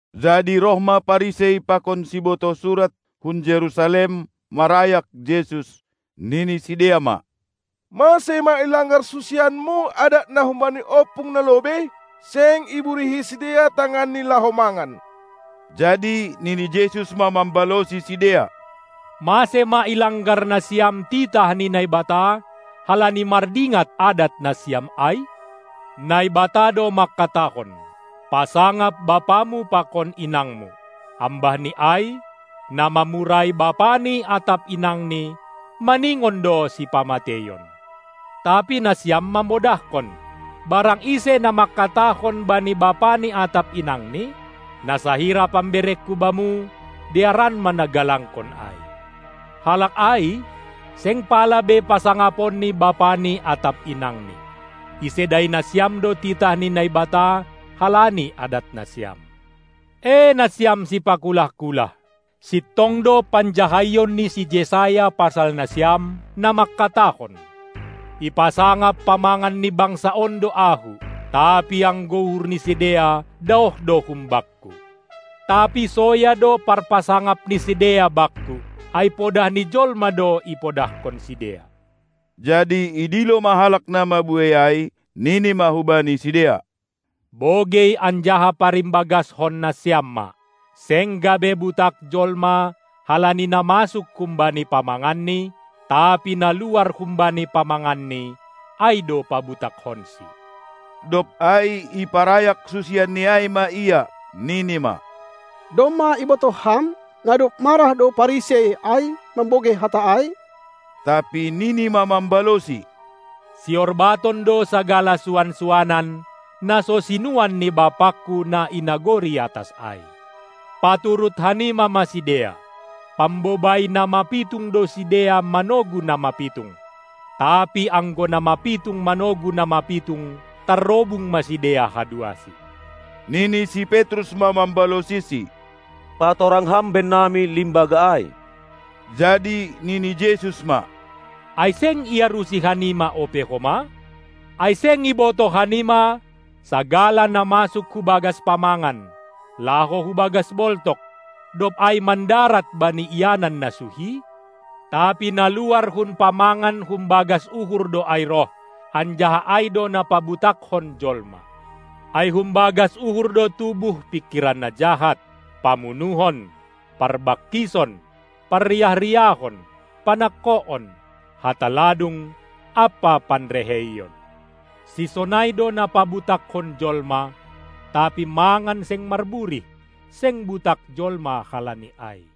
Jadi roh ma Parisei pakon sibotoh surat hun Jerusalem marayak Jesus, nini sidea ma: Mase ma ilanggar susianMu adat na humbani ompung na lobei? Seng iburihi sidea tanganni laho mangan. Jadi nini Jesus ma mambalosi sidea: Mase ma ilanggar nasiam titah ni Naibata, halani mardingat adat nasiam ai? Naibata do mangkatahon: "Pasangap bapamu pakon inangmu!" ambahni ai: "Na mamurai bapani atap inangni, maningon do sipamateion!" Tapi nasiam mamodahkon: Barang ise na mangkatahon bani bapani atap inangni: "na sahira pamberengku bamu, dearan ma nagalangkon ai!" Halak ai, seng pala be pasangaponni bapani atap inangni. Isedai nasiam do titah ni Naibata halani adat nasiam. E nasiam sipakulah-kulah! Sintong do panjahaion ni si Jesaya pasal nasiam, na mangkatahon: Ipasangap pamangan ni bangsa on do Ahu, tapi anggo uhur ni sidea daoh do hum Bakku. Tapi soya do parpasangap ni sidea Bakku, ai podah ni jolma do ipodahkon sidea. Jadi idilo ma halak na mabuei ai, nini ma hubani sidea: Bogei anjaha parimbagaskon nasiam ma! Seng gabe butak jolma halani na masuk humbani pamanganni, tapi na luar humbani pamanganni ai do pabutakkonsi. Dob ai iparayak susianNi ai ma Ia, nini ma: Domma ibotoh Ham, na dob marah do Parisei ai mambogei hata ai? Tapi nini ma mambalosi: Siorbaton do sagala suan-suanan, na so sinuan ni BapangKu na i nagori atas ai. Paturut hanima ma sidea; pambobai na mapitung do sidea manogu na mapitung. Tapi anggo na mapitung manogu na mapitung, tarrobung ma sidea haduasi. Nini si Petrus ma mambalosiSi: Patorang Ham bennami limbaga ai! Jadi nini Jesus ma: Ai seng iarusi hanima ope homa? Ai seng ibotoh hanima, sagala na masuk hu bagas pamangan, laho hu bagas boltok, dob ai mandarat bani ianan na suhi? Tapi na luar hun pamangan humbagas uhur do ai roh, anjaha ai do na pabutakkon jolma. Ai humbagas uhur do tubuh pingkiran na jahat, pamunuhon, parbangkison, parriah-riahon, panangkoon, hata ladung ampa panreheion. Sisonai do na pabutakkon jolma, tapi mangan seng marburih, seng butak jolma halani ai.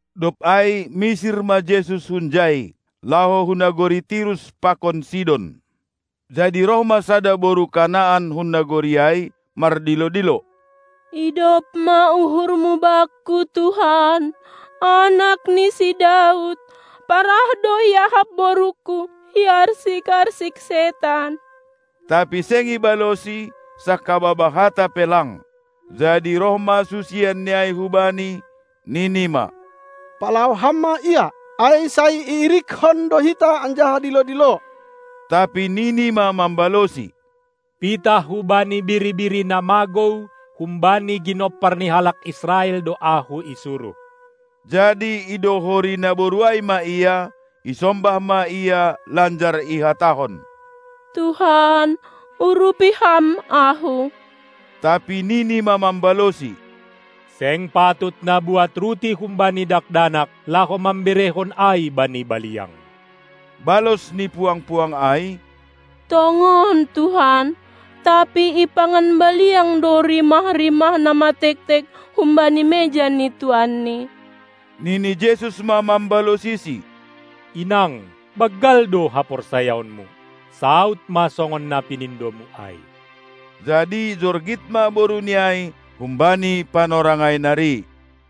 Dob ai misir ma Jesus hunjai, laho hu nagori Tirus pakon Sidon. Jadi roh ma sada boru Kanaan hun nagori ai mardilo-dilo: Idop ma uhurMu bakku, Tuhan, Anak ni si Daud! Parah do iahap borungku, iarsik-arsik setan. Tapi seng ibalosi, sangkababah hata pe lang. Jadi roh ma susianNi ai hu-Bani, nini ma: Palao Ham ma ia, ai sai iirikkon do hita anjaha dilo-dilo. Tapi nini ma mambalosi: Pitah hubani biri-biri na magou humbani ginompar ni halak Israel do Ahu isuruh. Jadi idohori naboru ai ma Ia, isombah ma Ia lanjar ihatahon: Tuhan, urupi Ham ahu! Tapi nini ma mambalosi: Seng patut nabuat ruti humbani dakdanak, laho mamberehon ai bani baliang. Balos ni puang-puang ai: Tongon, Tuhan, tapi ipangan baliang do rimah-rimah na matektek humbani meja ni tuanni. Nini Jesus ma mambalosisi: Inang, banggal do haporsayaonmu, saud ma songon na pinindomu ai! Jadi jorgit ma boruni ai humbani panorang ai nari.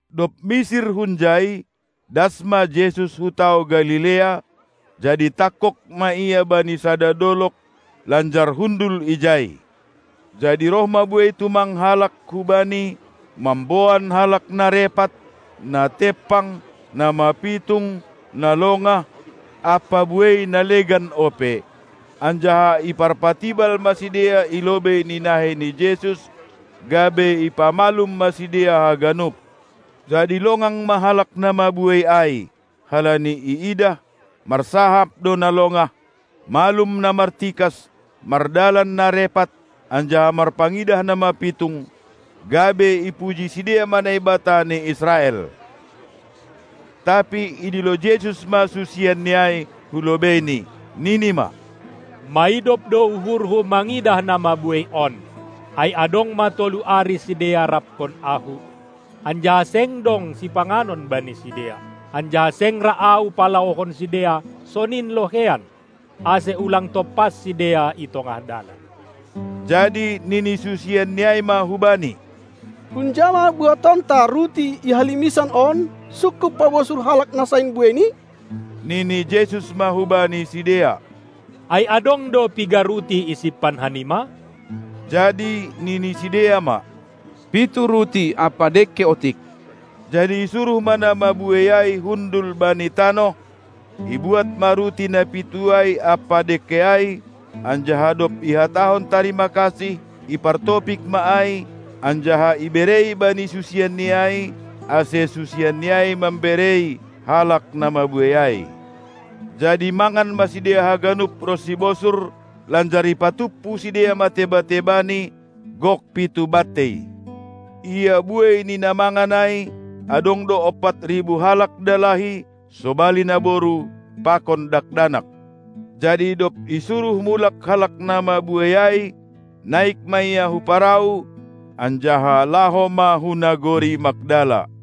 Dob misir hunjai, das ma Jesus hu tao Galilea, jadi tangkog ma Ia bani sada dolog, lanjar hundul ijai. Jadi roh ma buei tumang halak hu Bani mamboan halak na repat, na tempang, na mapitung, na longah ampa buei na legan ope, anjaha iparpatibal ma sidea i lobei ni nahei ni Jesus, gabe ipamalum ma sidea haganup. Jadi longang ma halak na mabuei ai, halani iidah, marsahap do na longah, malum na martikas, mardalan na repat, anjaha marpangidah na mapitung, gabe ipuji sidea ma Naibata ni Israel. Tapi idilo Jesus ma susianNi ai hu lobeiNi, nini ma: Maidop do uhurHu mangidah na mabuei on, ai adong ma tolu ari sidea rapkon Ahu, anjaha seng dong sipanganon bani sidea, anjaha seng ra Ahu palaohon sidea sonin loheian, ase ulang tompas sidea i tongah dalan. Jadi nini susianNi ai ma hu Bani: Hunja ma buatonta ruti i halimisan on sungkup pabosur halak na sain bueini? Nini Jesus ma hubani sidea: Ai adong do piga ruti isimpan hanima? Jadi nini sidea ma: Pitu ruti ampa dengke otik. Jadi isuruh ma na mabuei ai hundul bani tanoh, ibuat ma ruti na pitu ai ampa dengke ai, anjaha dob ihatahon tarima kasih, ipartopik ma ai, anjaha iberei bani susianNi ai, ase susianNi ai mamberei halak na mabuei ai. Jadi mangan ma sidea haganup ronsi bosur; lanjar ipatumpu sidea ma teba-tebani; gok pitu bantei. Ia buei ni na mangan ai, adong do ompat ribu halak dalahi, sobali naboru pakon dakdanak. Jadi dob isuruh mulak halak na mabuei ai, naik ma Ia hu parau, anjaha laho ma hu nagori Magdala.